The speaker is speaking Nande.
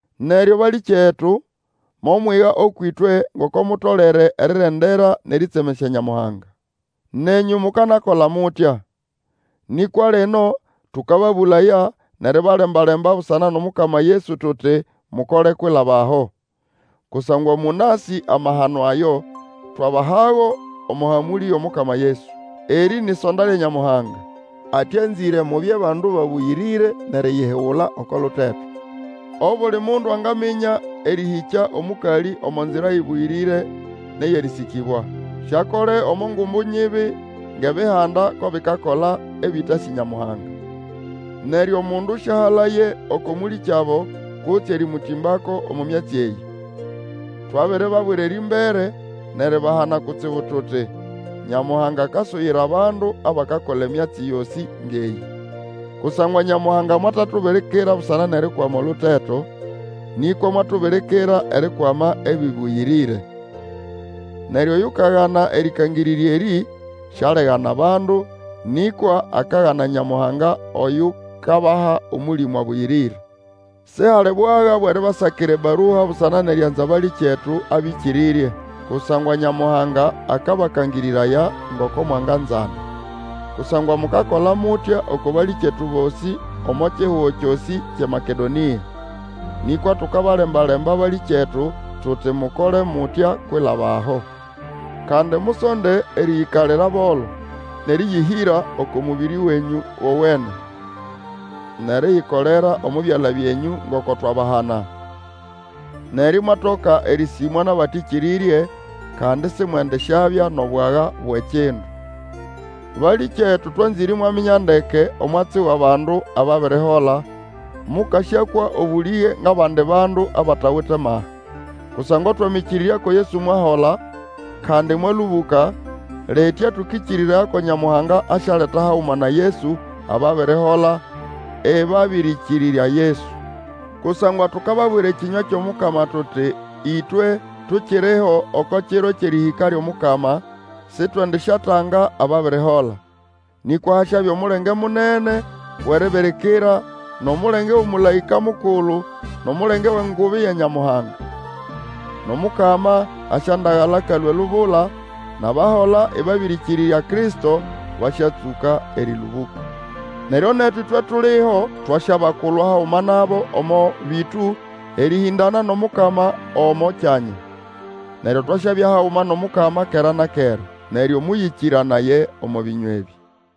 Neryo balĩkyetu, momwiga ũkwʼĩtwe ngoko mutolere erirendera nʼerĩtsemesya Nyamuhanga. Nenyũ mukanakola mutya. Nĩkwa lino tũkababũlaya, nʼeribalemba-lemba busana nʼOmukama Yesu, tuti mukole kwilaba aho. Kusangwa mũnasĩ amahano ayo, twabahago omo hamũlĩ yʼomukama Yesu. Erĩ ni ʼsonda lya Nyamuhanga, ati anzĩre mubye bandu babũyĩrĩre, nʼeriyihigula oko luteto. Obuli mundu angaminya erĩhĩkya omũkalĩ omo nzira ĩbũyĩrĩre nʼeyʼerĩsĩkĩbwa. Siakole omo ngumbu nyibi ngʼEbihanda ko bikakola, ebĩtasĩ Nyamuhanga. Neryo omundu sĩahalaye uku mũlĩkyabo kutse erĩmũtĩmbako omo myatsi eyĩ. Twabiribabwira erĩmbere nʼeribahana kutsibu tuti, Nyamuhanga akasuyira abandu abakakola emyatsi yosĩ ngʼeyĩ. Kusangwa Nyamuhanga mwatatubirikira busana nʼerikwama oluteto, nĩkwa mwatubirikira erikwama ebĩbũyĩrĩre. Neryo oyukagana erĩkangĩrĩrya erĩ, Sialigana bandu, nĩkwa akagana Nyamuhanga oyukabaha Omũlĩmũ Abũyĩrĩre. Sihali bwaga bwʼeribasakira ebarua busana nʼerianza abalĩkyetu abĩkĩrĩrye, kusangwa Nyamuhanga akabakangĩrĩraya ngoko mwanganzana. Kusangwa mukakola mutya oko balĩkyetu bosĩ omo kihugo kyosĩ kyʼeMakedonĩa. Nĩkwa tukabalemba-lemba, balĩkyetu, tuti mukole mutya kwilaba aho. Kandi musonde erĩyĩkalira bolo, nʼerĩyĩhĩra oko mũbĩrĩ wenyũ wowene, nʼeriyikolera omo byala byenyũ, ngoko twabahana. Neryo imwatoka erĩsĩmwa nʼabatĩkĩrĩrye, kandi simwendisyabya nʼobwaga bwʼekindu. Balĩkyetu, twanzĩre imwaminya ndeke omwatsi wʼabandu ababirihola, mũkasyakwa obũlĩge ngʼabandi bandu abatawite maha. Kusangwa Wamĩkĩrĩrya ko Yesu mwahola, kandi mwalũbũka. Litya tũkĩkĩrĩraya ko Nyamuhanga asyaleta haguma na Yesu ababirihola ĩbabĩrĩkĩrĩrya Yesu. Kusangwa tukababwira ekĩnywa kyʼomukama tuti ĩtwe, tukiriho, oko kiro kyʼerĩhĩka lyʼomukama, sitwendisyatanga ababirihola. Nĩkwa hasyabya omulenge munene wʼeribirikira, nʼomulenge, wʼomũlaĩka mukulu, nʼomulenge wʼengubi ya Nyamuhanga. NʼOmukama asyandagala akalũa elubula; nʼabahola ĩbabĩrĩkĩrĩrya Kristo basyatsũka erĩlũbũka. Neryo netu ĩtwe tuliho, twasyabalwa haguma nabo omo bĩtũ erĩhĩndana nʼOmukama omo kyanya. Neryo twasyabya haguma nʼOmukama kera na kera. Neryo mũyĩkĩranaye omo bĩnywa ebĩ.